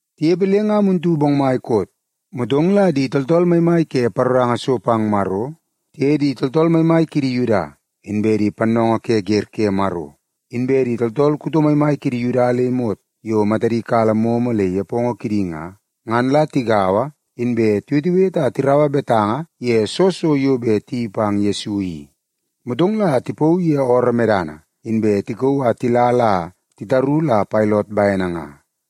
Tinepe le nga muntu bongmai koot, motong la di tooltool maimai ke paroranga so pang Maro, tiye di tooltool maimai kidi Yuda, inbe di pannoongoo ke wer ke Maro, inbe di tooltool kuto maimai kidi Yuda le imot yo matadi kala momo le nepongo kidi nga, ngan la tigaua inbe tiwetewete a tiraua betanga ye soo so yo bet tiyeii pang Yesu i. Motong la tipauu ye ooroo medana, inbe tikauu a tila la titaru la Pailot bene nga.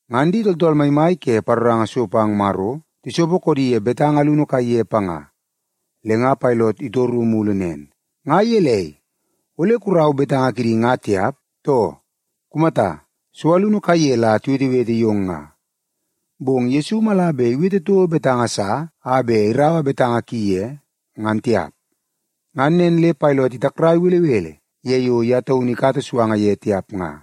Ngan di tooltool maimai ke paroranga so pang Maro tisopo koodi ye betanga alunu kaiye panga. Le nga Pailot itoru mulu nen, “Nga gelei ole kurau betanga kidi nga tiap, too? Kumata, so alunu kaiye la tiwetewete yong nga.” Bong ngan Yesu mala bet iwete toko betanga sa a bet iraua betanga ki ye, ngan tiap. Ngan nen le Pailot itakrai belebele ye yo ye taunu ikata suanga ye tiap nga.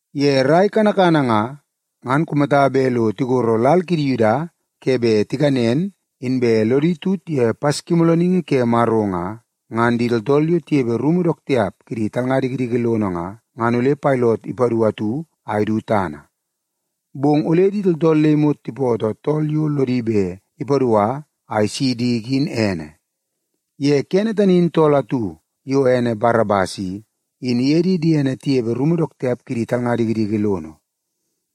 Ye rai kanakana nga, ngan kumata bet lo tigoro lal kidi Yuda ke bet tikanen inbe lodi tut ye Paskimoolooningi ke Maro nga, ngan di tooltool yo tinepe rumu dook tiap kidi talnga dikidiki lono nga, ngan ole Pailot ipadu atu a idu tana. Bong ole di tooltool le imot tipootoo tool yo lodi bet ipadua a isi diki in ene. Ye kene tani in tool atu yo ene Barabas i, in iye di diene tinepe rumu dook tiap kidi talnga dikidiki lono.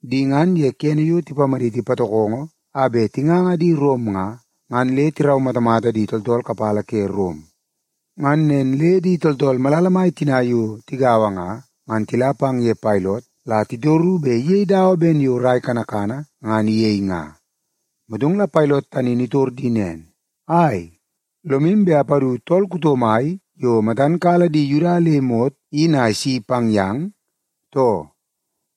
Di ngan ye kene yo tipamaditi patokongo a bet tinganga di Rom nga, ngan le tiraumatamata di tooltool kapala ke Rom. Ngan nen le di tooltool malala mai tina yo tigaua nga, ngan tila pang ye Pailot la titoru bet iyei dawa ben yo rai kanakana ngan iyei nga. Motong la Pailot tani in itor di nen, “Ai, lomu bet apadu tool kuto mai yo matan kala di Yuda le imot in a isi pang yang, too?”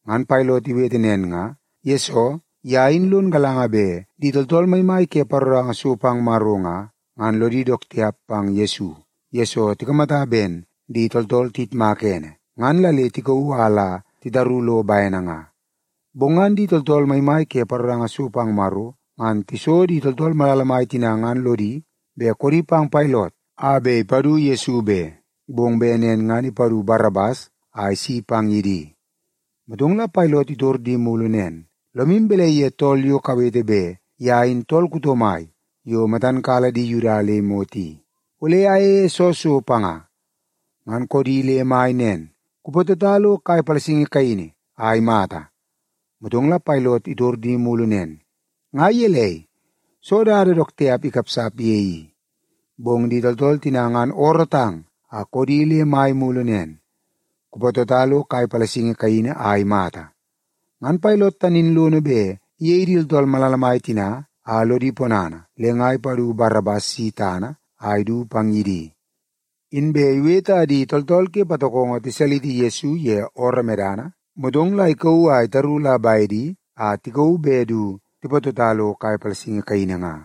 Ngan Pailot iwete nen nga, yesoo ye in lon galanga bet di tooltool maimai ke paroranga so pang Maro nga, ngan lodi dook tiap pang Yesu, yesoo tikamata ben di tooltool tiyitmaka ene, ngan la le tikauu a la titaru lo bene nga. Bong ngan di tooltool maimai ke paroranga so pang Maro ngan tiso di tooltool malala mai tina ngan lodi bet koodi pang Pailot a bet ipadu Yesu be, bong bet nen ngan ipadu Barabas a isi pang ye di. Motong la Pailot itor di mulu nen, “Lomu balai ye tool yo kawete bet ye in tool kuto mai yo matan kala di Yuda le imot i? Ole ayeie soo so panga?” Ngan koodi le mai nen, “Kupatota lo kai palasingi kaini a imata!” Motong la Pailot itor di mulu nen, “Nga gelei? Soo dada dook tiap ikapsap ye i?” Bong di tooltool tina ngan oorootang a koodi le mai mulu nen, “Kupatota lo kai palasingi kaini a imata!” Ngan Pailot tani in lono bet iyei di tooltool malala mai tina a lodi ponana, le nga ipadu Barabas si tana a idu pang ye di. Inbe iwete a di tooltool ke patokongo tisaliti Yesu ye ooroo medana, motong la ikauu a itaru la bedi a tikauu bet du tipatota lo kai palasingi kaini nga.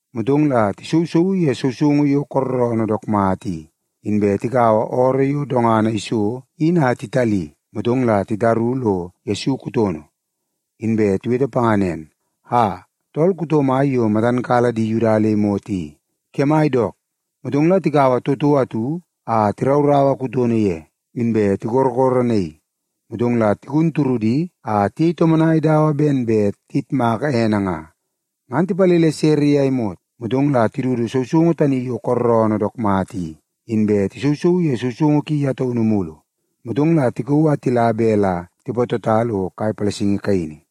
Motong la tisousouu ye sousoungu yo kooroonoo dook mata i, inbe tikaua ooroo yo dongana iso in a titali, motong la titaru lo Yesu kutono. Inbe tiwete panga nen, “Aa, tool kuto mai yo matam kala di Yuda le imot i, kemai dook!” Motong la tikaua toto atu a tirauraua kutono ye, inbe tikorokoronaii. Motong la tigun turudi a tiyei tomonai dawa ben bet tiyitmak ene nga. Ngan tipalele sere ye a imot, motong la tidudu sousoungu tani yo kooroonoo dook mata i, inbe tisousouu ye sousoungu ki ye taunu mulu. Motong la tikauu a tila bet la tipatota lo kai palasingi kaini.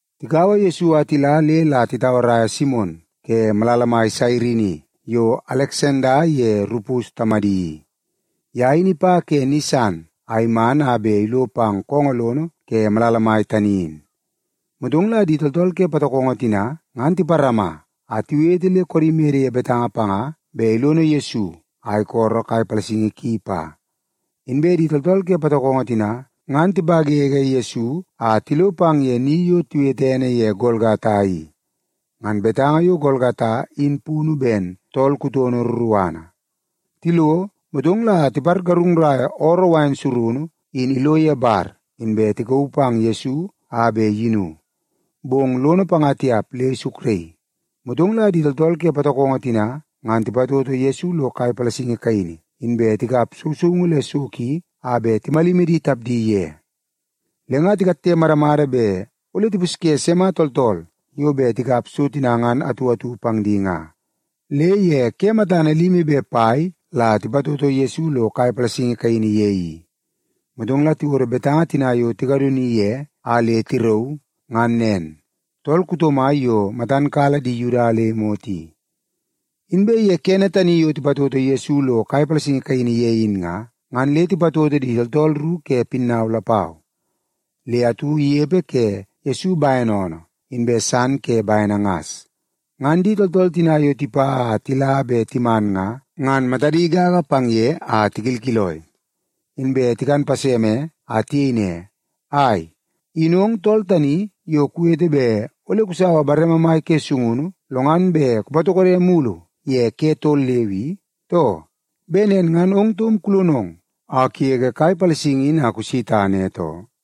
Tikaua Yesu a tila le la titauaraia Simon ke malala mai Sairini yo Aleksanda ye Rupus tamadi i. Ye in ipa ke ni san a iman a bet ilo pang koongoo lono ke malala mai tani in. Motong la di tooltool ke patokongo tina ngan tiparama a tiwete le koodi mede ye betanga panga bet ilono Yesu a isolo kai palasingi ki pa. Inbe di tooltool ke patokongo tina, ngan tipawewe Yesu a tilo pang ye ni yo tiwete ene ye Golgata i. (Ngan betanga yo Golgata in punu ben, Tool Kutono Ruruana). Tilo, motong la tipargarungnai ooroo wain surunu in ilo ye bar, inbe tikauu pang Yesu a bet iyinu. Bong lono panga tiap le isukraii. Motong la di tooltool ke patokongo tina ngan tipatoto Yesu lo kai palasingi kaini, inbe tikap sousoungu le so ki a bet timalimi di tapdi ye. Le nga titoo moomoo kidi a tikatte madamada bet ole tipusye sima tooltool yo bet tikap so tina ngan atu atu pang di nga. Le ye ke matana limi be pai la tipatoto Yesu lo kai palasingi kaini ye i. Motong la tiwodo betanga tina yo tikadoni ye a le tirauu, ngan nen: Tool Kuto Mai Yo Matan Kala Di Yuda Le Imot I. Inbe ye kene tani yo tipatoto Yesu lo kai palasingi kaini ye in nga, ngan le tipatoto di tooltool ru ke pinnau lapau. Le atu inepe ke Yesu bene oonoo, inbe san ke bene ngas. Ngan di tooltool tina yo tipa a tila be timan nga, ngan matadi gaga pang ye a tikilkiloi. Inbe tikan paseme, a tiyei ne, “Ai! In ong tool tani yo kuwete bet ole kusaua bareme mai ke sungunu, lo ngan bet kupatokode mulu ye ke tol leu i, too? Bet nen ngan ong taum kulonong a kugege kai palasingi in a kusi tana, e too.”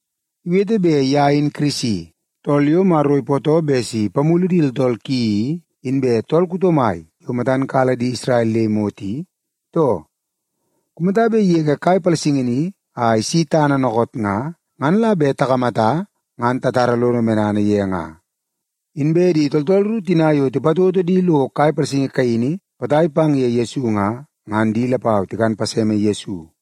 Iwete bet ye in Kirisi, tool yo Maro ipootoo bet si ipamulu di tooltool ki i, inbe tool kuto mai yo matan kala di Isrel le imot i, too? Kumata bet igege kai palasingi ni a isi tana dookoot nga, ngan la bet takamata, ngan tatara lodo medana ye nga.” Inbe di tooltool ru tina yo tipatoto di lo kai palasingi kaini potai pang ye Yesu nga, ngan di lapau tikan paseme Yesu.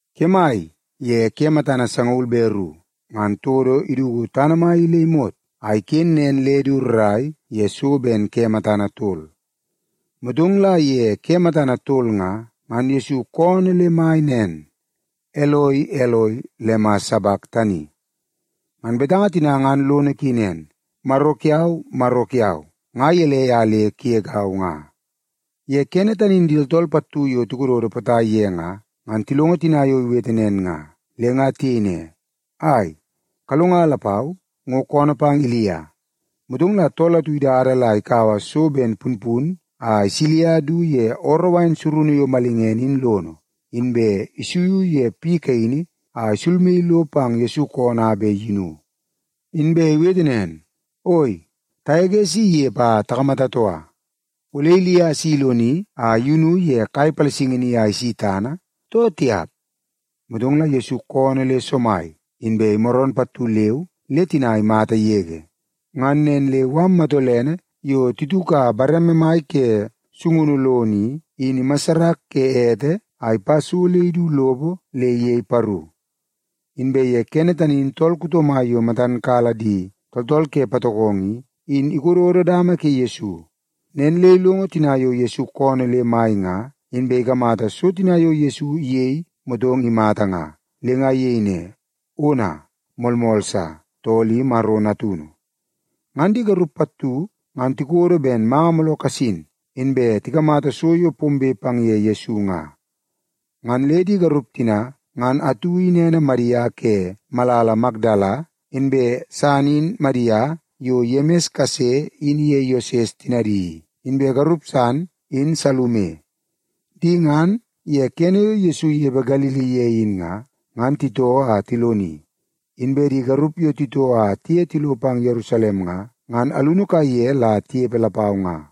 Kemai ye ke matana sangaul be ru, ngan todo iduku tana mai i le imot, a iken nen le du rrai ye so ben ke matana tol. Motong la ye ke matana tol nga, ngan Yesu koonoo le mai nen, “Eloi, Eloi, lema sabaktani?” Ngan betanga tina ngan lono ki nen, “Maro kiau, Maro kiau, nga gelei a le kugegau nga?” Ye kene tani in di tooltool pattu yo tikododo potai ye nga, ngan tilongo tina yo iwete nen nga, le nga tiyei ne, “Ai, kalonga lapau, ngo koonoo pang Ilia.” Motong la tool atu idada la ikaua so ben punpun a isilia du ye ooroo wain surunu yo malingene in lono, inbe isuiu ye piu kaini a isulmaii lo pang Yesu koonoo a bet iyinu. Inbe iwete nen, “Oi, tagege si inepe a takamata toka. Ole Ilia si iloni a iyunu ye kai palasingi ni a isi tana, too tiap?” Motong la Yesu koonoo le somai, inbe imaroon pattu leu le tina imata yege. Ngan nen le mala matolene yo tituka bareme mai ke sungunu lono i, in imassarak ke ete a ipa so le idu lopo le iyei paru. Inbe ye kene tani in tool kuto mai yo matan kala di tooltool ke patokongo i, in ikododo dama ke Yesu. Nen le ilongo tina yo Yesu koonoo le mai nga, inbe ikamata so tina yo Yesu iyei motong imata nga, le nga iyei ne, “Ona, moolmool sa, tool i Maro Natunu!” Ngan di garup pattu ngan tikodo ben manga mooloo kasin, inbe tikamata so yo pombe pang ye Yesu nga. Ngan le di garup tina, ngan atu in ene Madia ke malala Makdala, inbe san in Madia yo Yemis kase in iye Yoses tinadi i, inbe garup san in Salume. Di ngan, ye kene yo Yesu inepe Galili ye in nga, ngan titoo a tiloni. Inbe di garup yo titoo a tiye tilo pang Yerusalem nga, ngan alunu kaiye la tinepe lapau nga.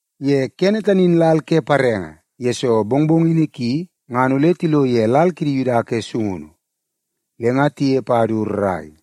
Ye kene tani in lal ke parenge, yesoo mongmongini ki ngan ole tilo ye lal kidi Yuda ke sungunu. Le nga tinepe a du rrai,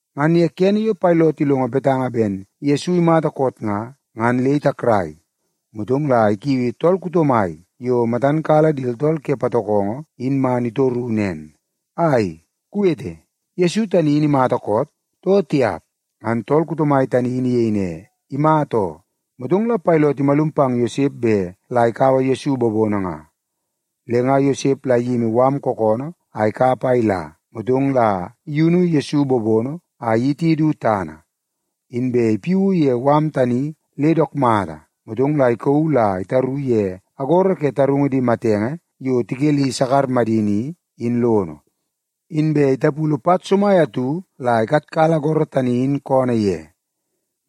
Ngan ye kene yo Pailot ilongo betanga ben Yesu imata koot nga, ngan le itakrai. Motong la ikiui tool kuto mai yo matan kala di tooltool ke patokongo in man itoru nen, “Ai, kuwete, Yesu tani in imata koot, too tiap?” Ngan tool kuto mai tani in iyei ne, “Imata oo.” Motong la Pailot imalum pang Yosep bet la ikaua Yesu bobono nga. Le nga Yosep la iyimi mala kookoonoo a ikap a ila, motong la iyunu Yesu bobono a iyiti du tana. Inbe ipiuu ye mala tani le dook mata, motong la ikauu la itaru ye agoro ke tarungu di matenge yo tikeli sakar madini i, in lono. Inbe itapulu pat somai atu la ikatkala agoro tani in koonoo ye.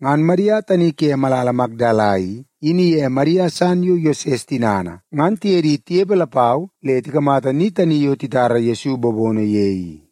Ngan Madia tani ke malala Makdala i, in iye Madia san yo Yoses tinana i, ngan tiye di tinepe lapau le tikamata ni tani yo titara Yesu bobono ye i.